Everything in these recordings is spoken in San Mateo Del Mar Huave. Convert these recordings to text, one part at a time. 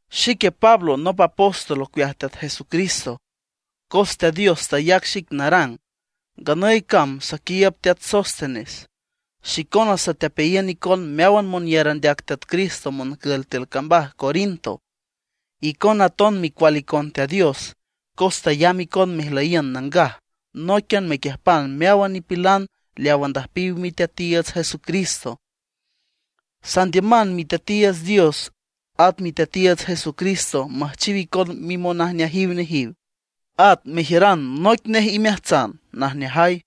Xique Pablo nop apóstol ocueaj Teat Jesucristo, cos Teat Dios tayac xic narang. Nganüy cam saquiiüb teat Sóstenes. Xicona satepeayiün icon meáwan monyar andeac Teat Cristo moncül tiül cambaj Corinto; icona aton micual icon Teat Dios cos tayamb icon mejlüyiün nangaj nóiquian mequiüjpan meáwan nipilan leaw andüjpiw Miteatiiüts Jesucristo. Sandiüman Miteatiiüts Dios at Miteatiiüts Jesucristo müjchiw icon mimonajneajiw, at mejiüran noic omeajtsan najneajay.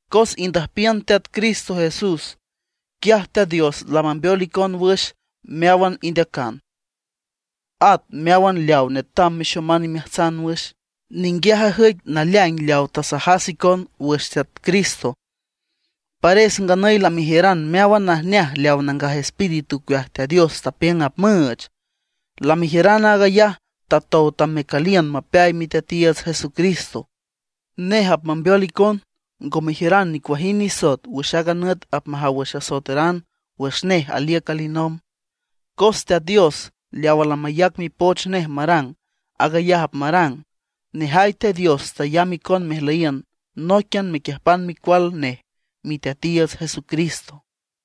Cos indüjpiün Teat Cristo Jesús, quiaj Teat Dios lamambeol icon wüx meáwan indeacan, at meáwan leaw netam mexoman imeajtsan wüx. Ninguiaj ajüic naleaing leaw tasajas icon wüx Teat Cristo. Pares nganüy lamejiüran meáwan najneaj leaw Nangaj Espíritu ocueaj Teat Dios tapiüng apmüüch. Lamejiüran aag ayaj tatow tam mecüliün mapeay Miteatiiüts Jesucristo. Nej apmambeol icon ngo mejiüran nicuajind nisoet wüx aaga nüt apmajaw wüx asoeteran wüx nej aliüc alinomb. Cos Teat Dios leawa lamayac mipoch nej marang, aag ayaj apmarang. Nejay Teat Dios tayamb icon mejlüyiün nóiquian mequiüjpan Micual nej Miteatiiüts Jesucristo.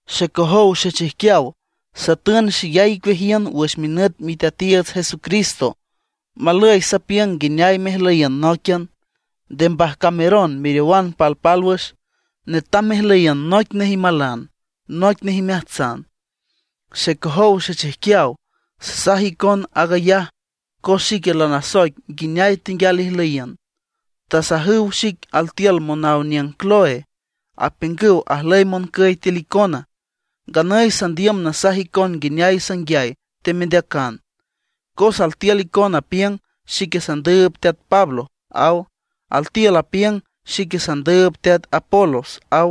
Xecojow xechijquiaw, satün xeyay icueajiün wüx minüt Miteatiiüts Jesucristo; malüy sapiüng nguineay mejlüyiün nóiquian. Nde mbajcameron meriowan palpálwüx; netam mejlüyiün noic nej imalan, noic nej imeajtsan. Xecojow xechijquiaw, sasaj icon aag ayaj cos xique lanasoic nguineay tenguial ijlüyiün; tasajüw xic altiül monaw aniüng Cloé. Apiüngüw ajlüy moncüy tiül icona. Nganüy sandiüm nasaj icon nguineay sanguiay temendeacan; cos altiül icon apiüng: “Xique sandüüb teat Pablo”, aw; altiül apiüng: “Xique sandüüb teat Apolos”, aw;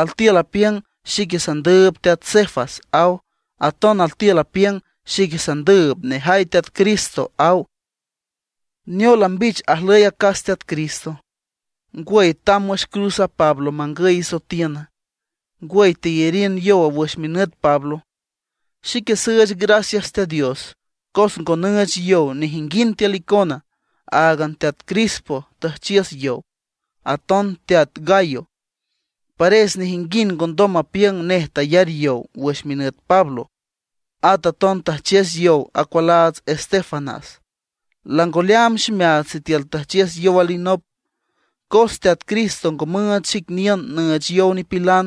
altiül apiüng: “Xique sandüüb teat Cefas”, aw; aton altiül apiüng: “Xique sandüüb nejay Teat Cristo”, aw. ¿Neola, mbich ajlüy acas Teat Cristo? ¿Ngwüy, tamb wüx cruz a Pablo mangüy isoetiün? ¿Ngwüy, teyariün yow wüx minüt Pablo? Xique süüch gracias Teat Dios, cos ngo nüüch yow nejinguind icon; áagan teat Crispo tüjchiüs yow, aton teat Gayo. Pares nejinguind ngondom mapiüng nej tayar yow wüx minüt Pablo. At aton tüjchiüs yow acualaats Estéfanas. Lango leaam ximeaats sitiül tüjchiüs yow alinop. Cos Teat Cristo ngo müüch xic niün nüüch yow nipilan;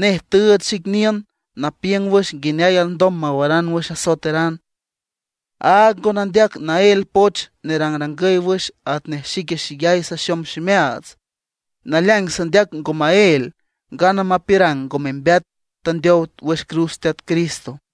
nej tüüch xic niün napiüng wüx nguineay alndom mawaran wüx asoeteran. Áag ngo nandeac naél poch nerangrangüy wüx atnej xique xeyay saxom ximeaats. Naleaing sandeac ngo maél ngana mapiürang ngo membeat tandeow wüx cruz Teat Cristo.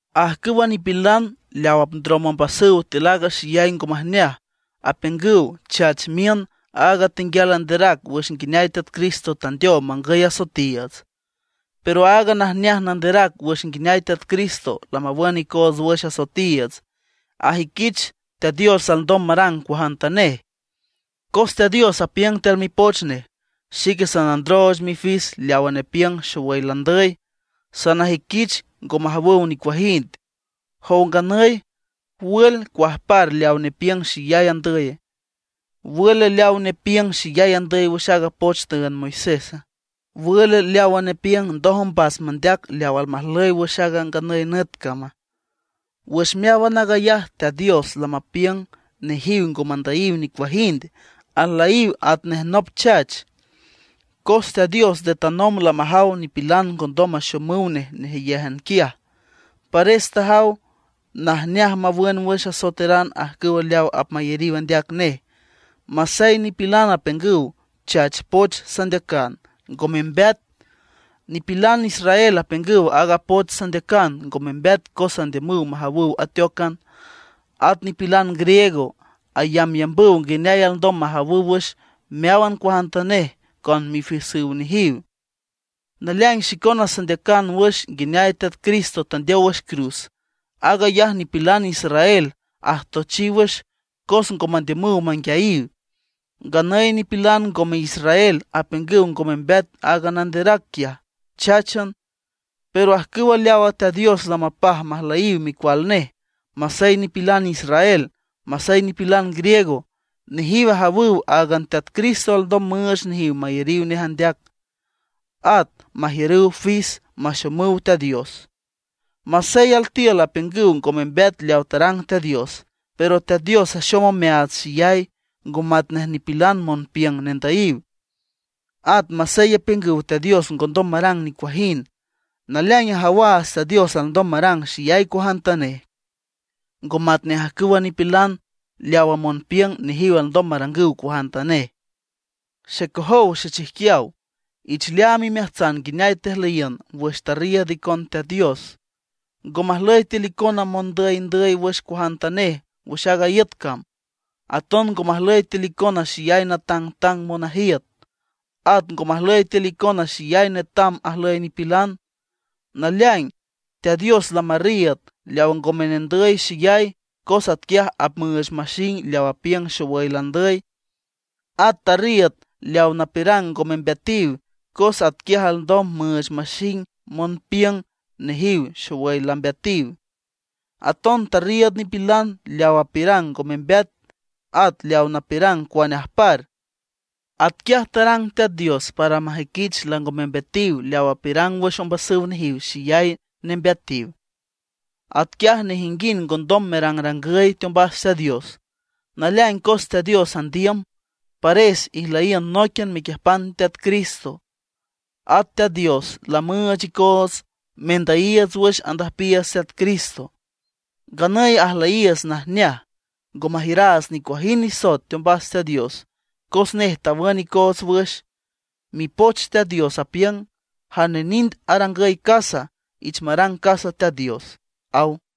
Ajcüwa nipilan leaw apndrom ombasüw tiül aaga xeyay ngo majneaj apiüngüw chach miün aaga tenguial anderac wüx nguineay Teat Cristo tandeow mangüy asoetiiüts. Pero aaga najneaj nanderac wüx nguineay Teat Cristo lamawün icoots wüx asoetiiüts ajüiquich Teat Dios alndom marang cuajantanej. Cos Teat Dios apiüng tiül mipoch nej: Xique sanandrooch mifis leawa nepiüng xowüy landüy; sanajüiquich ngo majawüw nicuajind. Jow nganüy, ¿wül, cuajpar leaw nepiüng xeyay andüye? ¿Wül leawa nepiüng xeyay andüy wüx aaga poch tüünd Moisésa? ¿Wül leawa nepiüng ndoj ombas mandeac leaw almajlüy wüx aaga nganüy nüt cama? Wüx meáwan aag ayaj Teat Dios lamapiüng nejiw ngo mandüyiw nicuajind, ajlüyiw atnej nop chach. Cos Teat Dios nde tanomb lamajaw nipilan ngondom maxomüw nej nejeyéjan quiaj, pares tajaw najneaj mawün wüx asoeteran ajcüw leaw apmayariw andeac nej, masey nipilan apiüngüw chach poch sandeacan, ngo membeat. Nipilan israel apiüngüw aaga poch sandeacan ngo membeat cos andiümüw majawüw ateócan; at nipilan griego ayambyambüw nguineay alndom majawüw wüx meáwan cuajantanej con mifisüw nejiw. Naleaing xicona sandeacan wüx nguineay Teat Cristo tandeow wüx cruz; aag ayaj nipilan israel ajtochiw wüx cos ngo mandiümüw manguiayiw. Nganüy nipilan ngome israel apiüngüw ngo membeat aaga nanderac quiaj, cháchan. Pero ajcüw leawa Teat Dios lamapaj majlüyiw micual nej, masey nipilan israel, masey nipilan griego, nejiw ajawüw áagan Teat Cristo alndom müüch nejiw mayariw nej andeac, at majiürüw fis maxomüw Teat Dios. Masey altiül apiüngüw ngo membeat leawa tarang Teat Dios, pero Teat Dios axom omeaats xeyay, ngo matnej nipilan monpiüng nendüyiw. At masey apiüngüw Teat Dios ngondom marang nicuajind, naleaing ajawaats Teat Dios alndom marang xeyay cuajantanej, ngo matnej ajcüwa nipilan leawa monpiüng nejiw alndom marangüw cuajantanej. Xecojow xechijquiaw, ich leaam imeajtsan nguineay tejlüyiün wüx tarriiüd icon Teat Dios. Ngo majlüy tiül icona mondüyndüy wüx cuajantanej wüx aaga iüt cam. Aton ngo majlüy tiül icona xeyay natangtang monajiüt; at ngo majlüy tiül icona xeyay netam ajlüy nipilan. Naleaing, Teat Dios lamarriiüd leaw ngome nendüy xeyay cos atquiaj apmüüch maxing leaw apiüng xowüy landüy. At tarriiüd leaw napiürang ngo membeatiw, cos atquiaj alndom müüch maxing monpiüng nejiw xowüy lambeatiw. Aton tarriiüd nipilan leaw apiürang ngo membeat, at leaw napiürang cuane ajpar. Atquiaj tarang Teat Dios para majüiquich lango membeatiw leaw apiürang wüx ombasüw nejiw xeyay nembeatiw. Atquiaj nejinguind ngondom merangrangüy teombas Teat Dios. Naleaing cos Teat Dios andiüm, pares ijlüyiün nóiquian mequiüjpan Teat Cristo. At Teat Dios lamüüch icoots mendüyiiüts wüx andüjpiiüts Teat Cristo. Nganüy ajlüyiiüts najneaj, ngo majiüraats nicuajind nisoet teombas Teat Dios cos nej tawün icoots wüx. Mipoch Teat Dios apiüng: “Jane nind arangüy casa, ich marang casa Teat Dios”, aw.